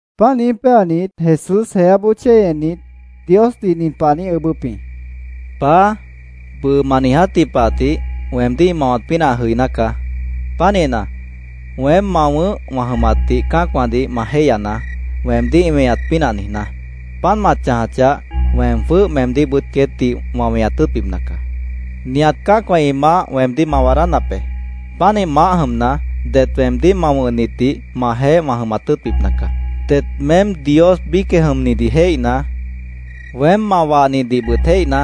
Páant niíj péanit, Jesús jeáboó chéi ennit, Diosdih nin pah ã niíj ʉʉ́bʉ́p jĩ: “Paá, bʉʉ ma niijátji pah tih weemdíh ĩ mawat pínah ã jʉiná caá. Pánihna, weém ma wʉ̃ʉ́h wã jʉmatdih cã́acwãdih ma jéihyanaá, weemdíh ĩ weñat pínah niijná. Páant ma chãjachah, weem jwʉ́h meemdíhbʉt queétdih wã weñat tʉ́ʉtbipna caá. Nihat cã́acwã ĩ maáh weemdíh ma waadánap be. Pánih maáh jʉmna, det weemdíh ma wʉ̃hnitdih majeéh wã jʉmat tʉ́ʉtbipna caá. Det meém Dios biícjeh jʉmnidih jéihna, weém ma wahnidihbʉt jéihna,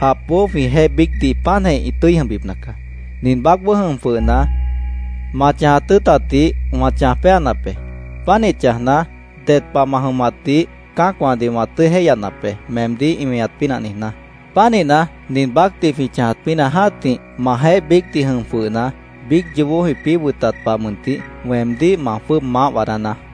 japboó jwĩjeéh biícdih páantjeh ĩ tʉ́i jʉmbipna caá. “Nin baácboó jʉm jwʉhna, ma chãjat tʉ́ʉtatjidih wã chãj péanap be. Pánih chãjna, ded pah ma jʉmatdih cã́acwãdih wã tʉ́i jéihyanap be, meemdíh ĩ weñat pínah niijná. Pánihna, nin baácdih jwĩ chãjat pínah jã́tih, majeéh biícdih jʉm jwʉhna, biíc yoobó jwĩpĩ́ wʉtat pah mʉntih, weemdíh ma jwʉ́ʉb maáh waadánaá.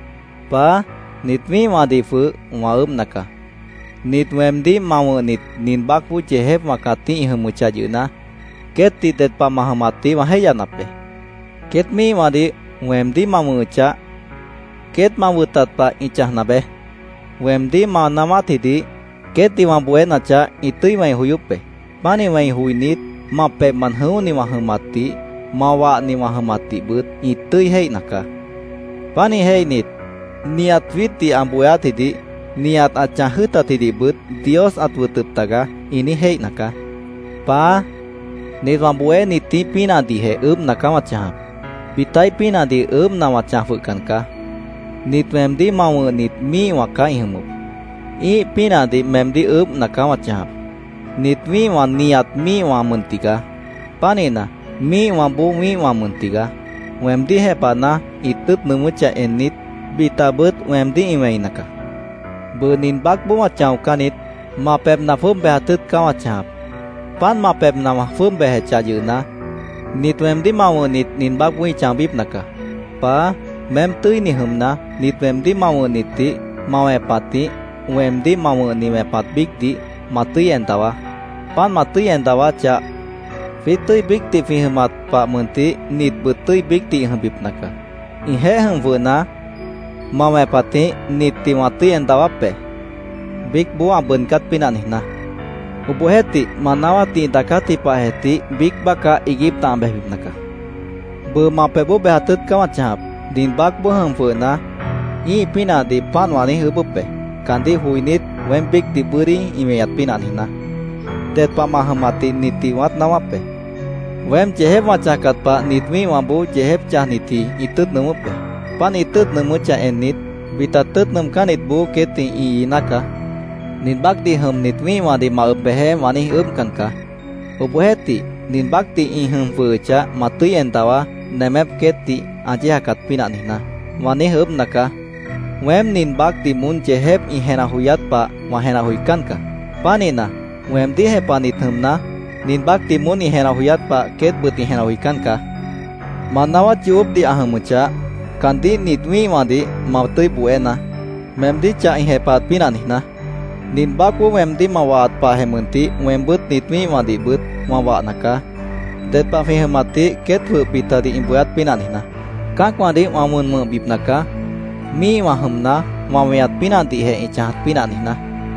“Paá, nit wĩ́ihwãdih jwʉh wã ʉʉ́bhna caá. Nit weemdíh ma wʉ̃hnit nin baácboó yeejépwã cãtíh ĩ jʉmʉchah yʉhna, queétdih ded pah ma jʉmatdih wã jéihyanap be. Queét míihwãdih weemdíh ma wʉ̃hʉchah, queét ma wʉtat pah ĩ chãjna beé. Weemdíh ma naáwátjidih queétdih wã bohénachah, ĩ tʉ́i wẽi joyóp be. Pánih wẽi joinít, ma pebhmant jʉ̃óhni wã jʉmatdih, ma wahni wã jʉmatdihbʉt ĩ tʉ́i jéihna caá. Pánih jéihnit, ‘Nihat jwiítdih ã bohéátjidih, nihat ã chãj jʉ́ʉtatjidihbʉt Dios ãt wʉtʉp taga’, ĩ niíj jéihna caá. “Paá, nit wã bohénitíh pínahdihjeh ʉʉ́bhna caá wã chãjap. Bitaíh pínahdih ʉʉ́bhna wã chãj jwʉhcan caá. Nit weemdíh ma wʉ̃hnit míihwã caá ĩ jʉmʉp. Ĩ́ih pínahdih meemdíh ʉʉ́bhna caá wã chãjap. Nit wĩ́ihwã nihat míihwã mʉn tigaá. Pánihna, míihwãboó wĩ́ihwã mʉn tigaá. Weemdíh jepahna, ĩ tʉ́ʉt nʉʉmʉ́chah ennit, bitabʉt weemdíh ĩ wẽina caá. “Bʉʉ nin baácboó wã chãocán niít. Ma pebhna jwʉ́ʉb bejat tʉ́ʉt caá wã chãjap. Páant ma pebhna wã jwʉ́ʉb bejechah yʉhna, nit weemdíh ma wʉ̃hnit nin baácboó ĩ chãobípna caá. Paá, meém tʉ́ini jʉmna, nit weemdíh ma wʉ̃hnitdih ma wẽpatjĩh, weemdíh ma wʉ̃hni wẽpat biícdih, ma tʉ́i en dawaá. Páant ma tʉ́i en dawáchah, jwiít tʉ́i biícdih jwĩ jʉmat pah mʉntih nitbʉt tʉ́i biícdih ĩ jʉmbipna caá. Ĩjeéh jʉm jwʉhna, ma wẽpatjĩh nitdih wã tʉ́i en dawáp be, biícboó ã bʉʉdcát pínah niijná. Obohjeéhtih, ma naáwátdih ĩ daacátji pahjeh tih, biíc bácah iiguípna ã bejbipna caá. “Bʉʉ ma pebhboó bejat tʉ́ʉt caá wã chãjap. Nin baácboó jʉm jwʉhna, ĩ́ih pínahdih páant wã niíj ʉʉ́bʉ́p be, caandíh joinít, weém biícdih bʉ́dí ĩ weñat pínah niijná. Ded pah ma jʉmatdih nitdih wãát naáwáp be. Weém yeejép wã chãjcat pah nit wĩ́ihwãboó yeejép chãjnitji ĩ tʉ́ʉt nʉʉmʉ́p be. Páant ĩ tʉ́ʉt nʉʉmʉ́chah ennit, bita tʉ́ʉt nʉʉmcánnitboó queétdih ĩ iiná caá. ‘Nin baácdih jʉmnit wĩ́ihwãdih ma ʉb bejeé’, wã niíj ʉʉ́bhcan caá. Obohjeéhtih, ‘nin baácdih ĩ jʉm jwʉhʉchah, ma tʉ́i en dawaá, Nemép queétdih ã yéejacat pínah niijná’, wã niíj ʉʉ́bhna caá. Weém nin baácdih moón yeejép ĩ jenah joyát pah wã jenah joicán caá. Pánihna, weemdíh jepahnit jʉmna, nin baácdih moón ĩ jenah joyát pah queétbʉt ĩ jenah joicán caá. Ma naáwát yoobópdih ã jʉmʉchah, caandíh nit wĩ́ihwãdih ma tʉ́i bohénaá, meemdíh chah ĩ jepahat pínah niijná. Nin baácboó weemdíh ma wahat pahjeh mʉntih, weembʉ́t nit wĩ́ihwãdihbʉt wã wahna caá, ded pah jwĩ jʉmatdih queét jwʉh bitadih ĩ bohéát pínah niijná. Cã́acwãdih wã wʉn wʉ̃hbipna caá, míihwã jʉmna, ma weñat pínahdihjeh ĩ chãjat pínah niijná.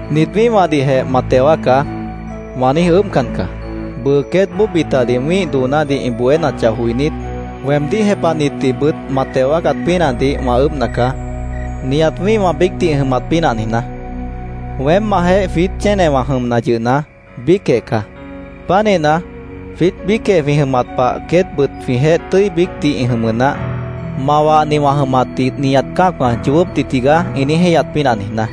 “ ‘Nit wĩ́ihwãdihjeh ma teo wáacá’, wã niíj ʉʉ́bhcan caá. Bʉʉ queétboó bitadih wĩ́ih doonádih ĩ bohénachah joinít, weemdíh jepahnitdihbʉt ma teo wáacat pínahdih wã ʉʉ́bhna caá, nihat wĩ́ihwã biícdih ĩ jʉmat pínah niijná. Weém majeéh jwiít chénewã jʉmna yʉhna, biícjeh caá. Pánihna, jwiít biícjeh jwĩ jʉmat pah queétbʉt jwĩjeéh tʉ́i biícdih ĩ jʉmʉ naáh, ma wahni wã jʉmatdih nihat cã́acwã ‘Yoobópdih tigaá’, ĩ niíj jéihyat pínah niijná.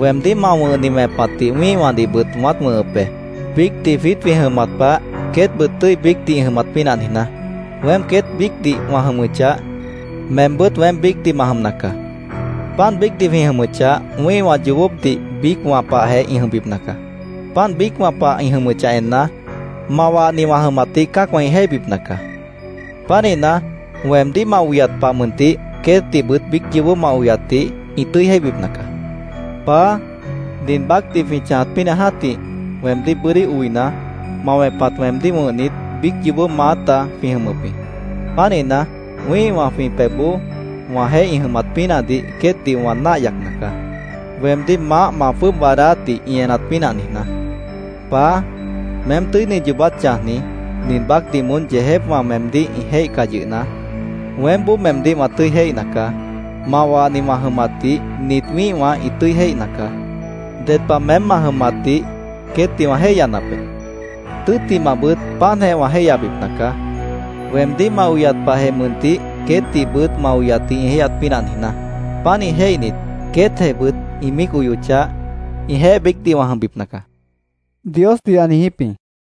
Weemdíh ma wʉ̃hni wẽpatdih wĩ́ihwãdihbʉt wãát wʉ̃hʉp be, biícdih jwiít jwĩ jʉmat pah, queétbʉt tʉ́i biícdih ĩ jʉmat pínah niijná. Weém queét biícdih wã jʉmʉchah, meembʉ́t weém biícdih ma jʉmna caá. Páant biícdih jwĩ jʉmʉchah, wĩ́ihwã yoobópdih biícwã pahjeh ĩ jʉmbipna caá. Páant biícwã pah ĩ jʉmʉchah enna, ma wahni wã jʉmatdih cã́acwã ĩ jéihbipna caá. Pánihna, weemdíh ma oyat pah mʉntih, queétdihbʉt biíc yoobó ma oyatdih ĩ tʉ́i jéihbipna caá. “Paá, nin baácdih jwĩ chãjat pínah jã́tih weemdíh bʉ́dí oina, ma wẽpat weemdíh wʉ̃hnit, biíc yoobó maáta jwĩ jʉmʉp jĩ. Pánihna, wĩ́ihwã jwĩ pebhboó wãjeéh ĩ jʉmat pínahdih queétdih wã náah yacna caá, weemdíh maáh ma jwʉ́ʉb waadáátdih ĩ enat pínah niijná. Paá, meém tʉ́ini yoobát chãjni, nin baácdih moón yeejépwã meemdíh ĩ jéihcah yʉhna, weémboó meemdíh wã tʉ́i jéihna caá. Ma wahni wã jʉmatdih nit wĩ́ihwã ĩ tʉ́i jéihna caá. Ded pah meém ma jʉmatdih queétdih wã jéihyanap be. Tʉ́ttimahbʉt, páantjeh wã jéihyabipna caá, weemdíh ma oyat pahjeh mʉntih queétdihbʉt ma oyatdih ĩ jéihyat pínah niijná. Pánih jéihnit, queétjehbʉt ĩ míic oyochah, ĩjeéh biícdih wã jʉmbipna caá”, Diosdih ã niijíp jĩ.